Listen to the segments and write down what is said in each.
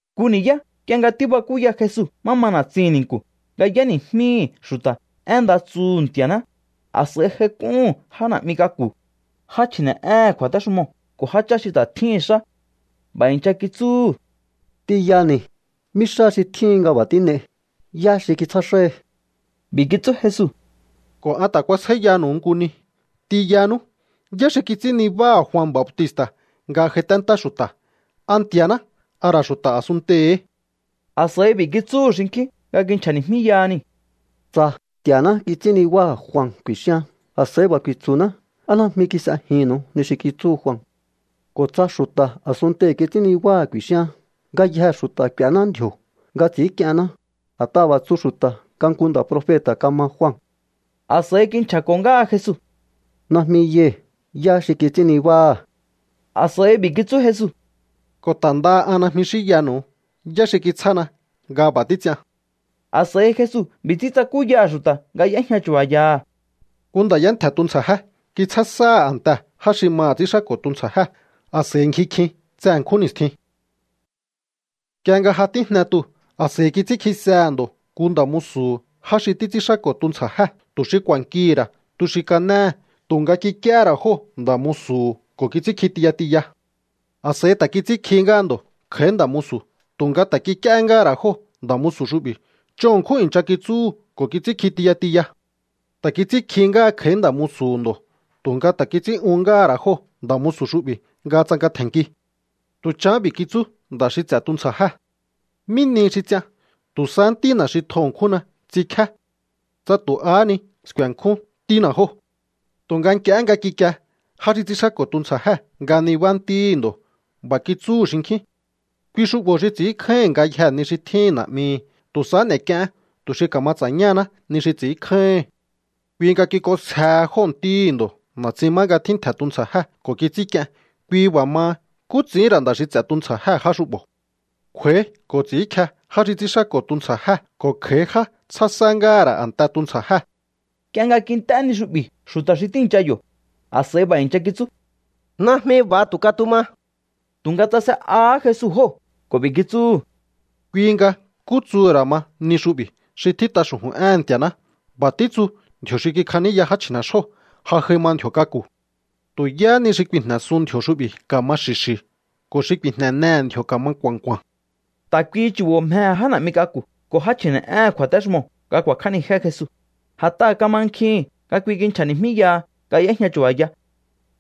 Nku ni̱yá nk'ie nga tíbakúya Jesu má ma na̱tsihi̱n ni̱nku̱ nga y'éni̱jmíhi̱ xu̱ta̱ én nda tsuhu̱ Nti̱a̱ná, a̱s'a̱i j'aik'úhu̱n já na̱'mi k'aku̱, já chji̱ne̱'éhe̱n kju̱a̱téxumoo̱ ko̱ jáchá xi ta̱ tjíhi̱n xá. B'a̱ i̱ncha kitsúhu̱: —T'inyani̱, ¿mí xá xi tjíhin nga b'a̱ tín'ei? ¿Yá xi kitsjá xáhi? B'i̱ kitsú Jesu: —Ko̱ an ta̱ kuasjáíyanu̱u nku ni. T'inyanú. ¿Yá xi kits'ín nibáha̱ Jua Bautista̱ nga j'aiténtá xu̱ta̱? ¿A Nti̱a̱ná, a ra̱ xu̱ta̱ a̱sunntei̱hí? A̱s'a̱i b'i̱ kitsúhu̱ xinkjín nga kinchja̱ni̱jmíyaha niu̱: —Tsa: “Nti̱a̱ná kits'ín nibáha̱ Jua”, ku̱i̱xíaán, a̱s'a̱i b'a̱ ku̱i̱tsu̱ná: “¿Á najmi kis'ejihi̱nnu̱u ni xi kitsúhu Jua?” Ko̱ tsa: “Xu̱ta̱ a̱sunntei̱ kits'ín nibáha̱” ku̱i̱xíaán, ngayjee̱ xu̱ta̱ k'u̱éná ndji̱o̱ nga ts'i̱ínk'ienná, a̱t'aha̱ b'a̱ tsu xu̱ta̱ nga nku nda̱ profeta̱ kama Jua. A̱s'a̱i kinchja̱ko̱ ngáha Jesu: —Najmi yai̱ yá xi kits'ín nibáha̱. A̱s'a̱i b'i̱ kitsú Jesu: —Ko̱ ta̱ ndaha an najmi xínyanu̱u yá xi kitsjána nga b'a̱ títs'ian. A̱s'a̱i Jesu b'i̱ ts'ín tsakúyaha̱ xu̱ta̱ nga y'éjña chu̱ba̱yaha̱: —Nku nda̱ y'éntje̱ tuntsja̱jé. Kitsjá sáha̱ a̱ntee̱ já xi maha̱ ts'ínxáko̱ tuntsja̱jée̱, a̱s'a̱i ngji kjin tse ṉkjún ni̱stjin. Nk'ie nga ja tíjne tuu̱, a̱s'a̱i kits'ínkjisehe̱ ndo̱ nku nda̱ musu̱hu̱ já xi títs'ínxáko̱ tuntsja̱jée̱ tu̱ xi ku̱a̱nkihi̱ ra̱ tu xi kanéhe̱. Tu̱nga kik'íéhé ra̱ jóo̱ nda̱ musu̱hu̱ ko̱ kits'ínkji tiya tiya. A̱s'a̱i ta̱ kits'ínkjihí ngáha ndo̱ kj'a̱í nda̱ musu̱, tu̱nga ta̱ kik'íéhé ngáha̱ ra̱ jóo̱ nda̱ musu̱ xu'bi̱. Ch'on ṉkjún i̱ncha kitsúhu̱ ko̱ kits'ínkji tiya tiya. Ta̱ kits'ínkjihí ngáha kj'a̱í nda̱ musu̱hu̱ ndo̱, tu̱nga ta̱ kits'ín'uhún ngáha̱ ra̱ jóo̱ nda̱ xu'bi̱ nga tsanka tje̱nnki. ’Tu̱ chahán b'i̱ kitsú nda̱ xi ts'e̱ tuntsja̱jée̱: “¿Mí nihi xi ts'ian? Tu̱ sahá ntína̱ xi tjo ṉkjúnna ts'inkjíá. Tsa tu̱ ahá ni sku̱e̱nkjún ntína̱ jóo̱.” Tu̱nga nk'iehé nga kikie já xi ts'ínxáko̱ tuntsja̱jée̱ nga nibá ntíhi̱ ndo̱, b'a̱ kitsúhu̱ xinkjín: “Kui xu'bo̱ xi ts'i̱ínkjáíhi̱n ngayjee̱ ni xi tjíhi̱n na̱'mihi̱. Tu̱ sahá n'e̱k'ieén tu̱ xi ka̱ma ts'a̱ñáhaná ni xi ts'i̱ínkjáíhi̱n.” Kui nga kik'onsjehe jóo̱ ntíhi̱ ndo̱ na̱tsin má nga tjíntje̱ tuntsja̱jée̱ ko̱ kits'ínk'ien. ’Kui b'a̱ maha, ¿nkú ts'i̱íhi̱n ra̱ nda̱ xi ts'e̱ tuntsja̱jée̱ já xu'bo̱? Kj'u̱a̱í ko̱ ts'i̱ínkje já xi ts'ínxáko̱ tuntsja̱jée̱ ko̱ kj'a̱í já tsjá sá ngáha̱ ra̱ a̱nte tuntsja̱jée̱. Nk'ie nga kint'é ni xu'bi̱ xu̱ta̱ xi tíi̱ncha yo̱, a̱s'a̱i b'a̱ i̱ncha kitsú: —¡Najmi b'a̱ tu̱ katuma! Tu̱nga tsase'ahá Jesu jóo̱ ko̱ b'i̱ kitsúhu̱: —Kui nga, ¿nkú tsuhu̱ ra̱ ma ni xu'bi̱ xi tjít'a xu̱ju̱n éhe̱n Nti̱a̱ná? B'a̱ títsu̱: Ndji̱o̱ xi kikjaníya já chji̱ne̱xóo̱, ja j'ai ma ndji̱o̱ k'aku̱. Tu̱ yáhá ni xi ku̱i̱jne̱sun ndji̱o̱ xu'bi̱ ka̱ma xi̱xi̱. Ko̱ xi ku̱i̱jne̱nehe̱ ndji̱o̱ ka̱ma nku̱a̱nku̱a̱n. Ta̱ kuihi chu̱bo̱ mjehe̱ já na̱'mi k'aku̱ ko̱ já chji̱ne̱'éhe̱n kju̱a̱téxumoo̱ nga ku̱a̱kj'ánijé Jesu, a̱t'aha̱ kamankjihi̱n nga kui kinchja̱ni̱jmíyaha nga y'éjña chu̱ba̱ya.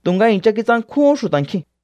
Tu̱nga i̱ncha kitsankjúhún xu̱ta̱ nkjiu̱n.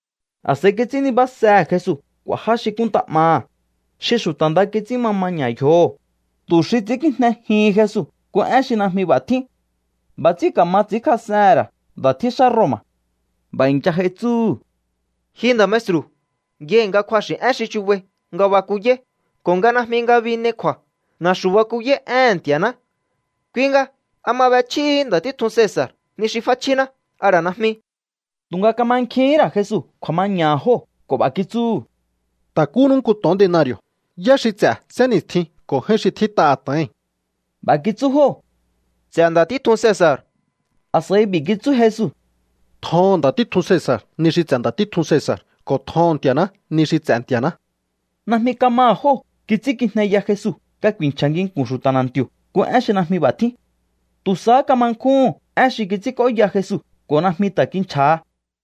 A̱s'a̱i kits'ín nibásehe̱ Jesu k'u̱a̱ já xi kúnnta 'maha̱, xi xu̱ta̱ nda kits'ín ma maña̱ yjoho̱, tu̱ xi ts'i̱ínkijnejihin Jesu nku én xi najmi b'a̱ tjín. B'a̱ ts'ín ka̱ma ts'i̱ínkjas'ehe̱n ra̱ nda̱ tjíxá Roma̱. B'a̱ i̱ncha j'ai tsúhu̱: —Ji nda̱ maestru̱, yai̱ nga kju̱axi̱ én xi chubai nga bakuyáí ko̱ nga najmi ngabi n'ei kju̱a̱. Na̱xu̱ bakuyáí éhe̱n Nti̱a̱ná. Kui nga, ¿a ma b'echjíhi̱í nda̱ títjun Cesa̱r ni xi f'áchjíná, a ra̱ najmi? Tu̱nga kamankjihín ra̱ Jesu kju̱a̱maña̱ha̱ jóo̱ ko̱ b'a̱ kitsúhu̱: —Ta̱kúnú nku to̱on denari̱o̱. ¿Yá xi ts'e̱ sénni̱stjii̱n ko̱ j'áín xi tjít'aha̱ to̱oi̱n? B'a̱ kitsú jóo̱: —Ts'e̱ nda̱ títjun Cesa̱r. A̱s'a̱i b'i̱ kitsú Jesu: —Tjoho̱on nda̱ títjun Cesa̱r ni xi ts'e̱ nda̱ títjun Cesa̱r, ko̱ tjoho̱on Nti̱a̱ná ni xi ts'e̱ Nti̱a̱ná. Najmi kamaha̱ jóo̱ kits'ínkijneya Jesu nga ku̱i̱nchja̱ nginku̱n xu̱ta̱ na̱nti̱o̱ nku én xi najmi b'a̱ tjín. Tu̱ sahá kama nkjúhu̱n én xi kits'ínk'óya Jesu ko̱ najmi ta̱ kinchja̱ha.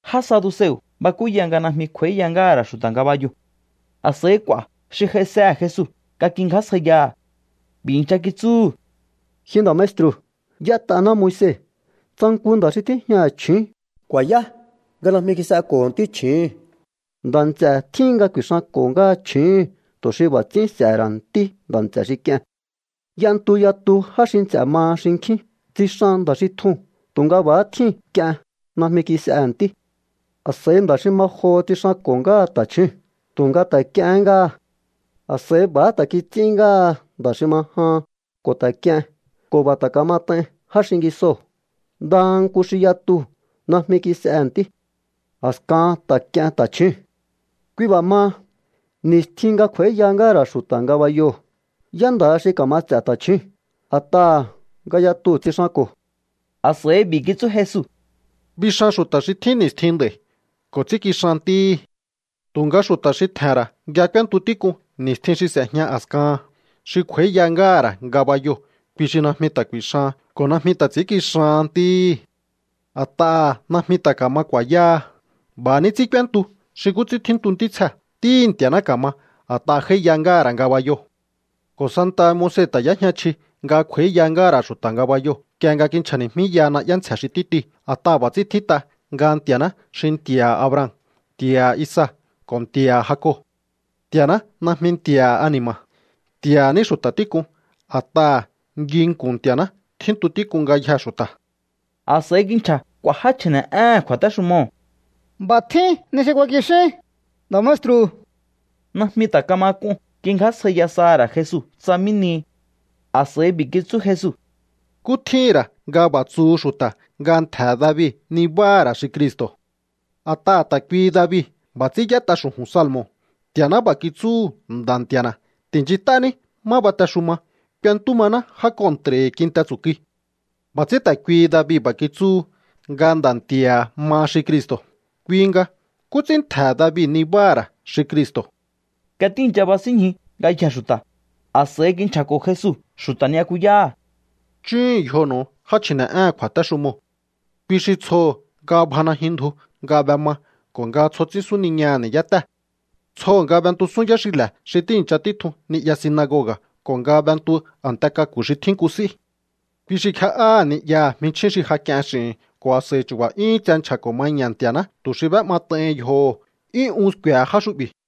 Já saduseo̱ bakúya nga najmi kj'u̱a̱íya ngáha̱ ra̱ xu̱ta̱ ngabayoo̱. A̱s'a̱i k'u̱a̱ xi j'aisehe̱ Jesu nga kingjásjaiyaha̱. B'i̱ i̱ncha kitsúhu̱: —Ji nda̱ maestru̱, y'ét'aná Moise: “Tsa nku nda̱ xi tíjñaha̱ chju̱ún kju̱a̱yá nga najmi kis'eko̱ho̱ ntí chju̱úhu̱n, nda̱ nts'e̱ tjíhin nga ku̱i̱xanko̱ ngáha chju̱úhu̱n, tu̱ xi b'a̱ ts'ín s'e̱he̱ ra̱ ntí nda̱ nts'e̱ xi k'ie̱n.” Y'entu yatu já xi nts'e̱ maha xinkjín. Tsixan nda̱ xi tjuu̱n tu̱nga b'a̱há tjíu̱n k'ien. Najmi kis'ehe̱ ntí. A̱s'a̱i nda̱ xi ma joho tsixanko̱ ngáha ta̱chjúu̱n, tu̱nga ta̱ k'iehén ngáha. A̱s'a̱i b'a̱há ta̱ kits'ín ngáha nda̱ xi ma jahan ko̱ ta̱ k'ien, ko̱ b'a̱ ta̱ kamat'ain já xingisoo̱. Ndaha nku xi yatuu̱ najmi kis'ehe̱ ntí. A̱sakahan ta̱ k'ien ta̱chjúu̱n. ’Kui b'a̱ maha, ni̱stjin nga kj'u̱a̱íya ngáha̱ ra̱ xu̱ta̱ ngabayoo̱, ¿yá nda̱ha xi ka̱ma ts'e̱ ta̱chjúu̱n? A̱t'aha̱ nga yatuu̱ tsixanko̱. A̱s'a̱i b'i̱ kitsú Jesu: —Bixan xu̱ta̱ xi tjín ni̱stjin nd'a̱i̱ ko̱ ts'ínkixan ntíhi̱. Tu̱nga xu̱ta̱ xi tje̱he̱n ra̱ nga k'úéntu tík'un ni̱stjin xi s'e̱jña a̱skahan, xi kj'u̱a̱íya ngáha̱ ra̱ ngabayoo̱, kui xi najmi ta̱ ku̱i̱xahan ko̱ najmi ta̱ ts'i̱ínkixahan ntíhi̱. A̱t'aha̱ najmi ta̱ ka̱ma ku̱a̱yáha. B'a̱ ní ts'ín k'úéntu xi nkú ts'ín tjíntu ntítsjee̱. Ntíhi̱ Nti̱a̱ná ka̱ma, a̱t'aha̱ j'áíya ngáha̱ ra̱ ngabayoo̱. ’Ko̱ santaha Moise ta̱ y'éjña chji nga kj'u̱a̱íya ngáha̱ ra̱ xu̱ta̱ ngabayoo̱, nk'ie nga kinchja̱ni̱jmíyaha na'yá ntsje̱ xi títiu̱. A̱t'aha̱ b'a̱ ts'ín tjít'a nga Nti̱a̱ná xi “Nti̱a̱ha̱ Abraham, Nti̱a̱ha̱ Isaac ko̱ Nti̱a̱ha̱ Jacob.” Nti̱a̱ná najmi Nti̱a̱ha̱ ani̱ma̱. Nti̱a̱ha̱ ní xu̱ta̱ tík'un. A̱t'aha̱ nginku̱n Nti̱a̱ná tjíntu tík'un ngayjee̱ xu̱ta̱. A̱s'a̱i kinchja̱ k'u̱a̱ já chji̱ne̱'éhe̱n kju̱a̱téxumoo̱: —B'a̱ tjín ni xi ku̱a̱kixín, nda̱ maestru̱. Najmi ta̱ kama k'un kingjásjaiya saha̱ ra̱ Jesu tsa mí nihi. A̱s'a̱i b'i̱ kitsú Jesu: —¿Nkú tjíhi̱n ra̱ nga b'a̱ tsuhu xu̱ta̱ nga ntje̱he̱ David nibáha̱ ra̱ xi Cristo̱? A̱t'aha̱ ta̱ kuihi David b'a̱ ts'ín y'ét'a xu̱ju̱n salmo̱: Nti̱a̱ná b'a̱ kitsúhu̱ Nda̱ Nti̱a̱na̱: “Ti̱nchint'ání má batexuma, k'uentú maná já kontra̱hi̱ kinte tsu̱kui.” B'a̱ ts'ín ta̱ kuihi David b'a̱ kitsúhu nga Nda̱ Nti̱a̱ha̱ maha xi Cristo̱. Kui nga, ¿nkú ts'ín ntje̱he̱ David nibáha̱ ra̱ xi Cristo̱? Nga tíi̱ncha basínñju ngayjee̱ xu̱ta̱, a̱s'a̱i kinchja̱ko̱ Jesu xu̱ta̱ ni'yakuyáha̱: —Chúhu̱un yjonu̱u já chji̱ne̱'éhe̱n kju̱a̱téxumoo̱. Kui xi tsjoho̱ nga bja najyun ndju nga b'ema ko̱ nga tsjo ts'ín súniñaha̱ ni̱yátée̱. Tsjoho̱ nga b'entusún yáxile̱ xi tíi̱ncha títjun ni'ya sinagoga̱ ko̱ nga b'entu a̱nte k'aku̱ xi tjín nku s'í. Kui xi kje'áha̱ ni'yaha̱ jminchjín xi ja k'ien x'i̱hi̱n ko̱ a̱s'a̱i chu̱ba̱ 'yúhún tse nchja̱ko̱ maña̱ Nti̱a̱ná tu̱ xi b'é'mat'aihin yjoho̱. 'Yún un sku̱e̱he̱ já xu'bi̱.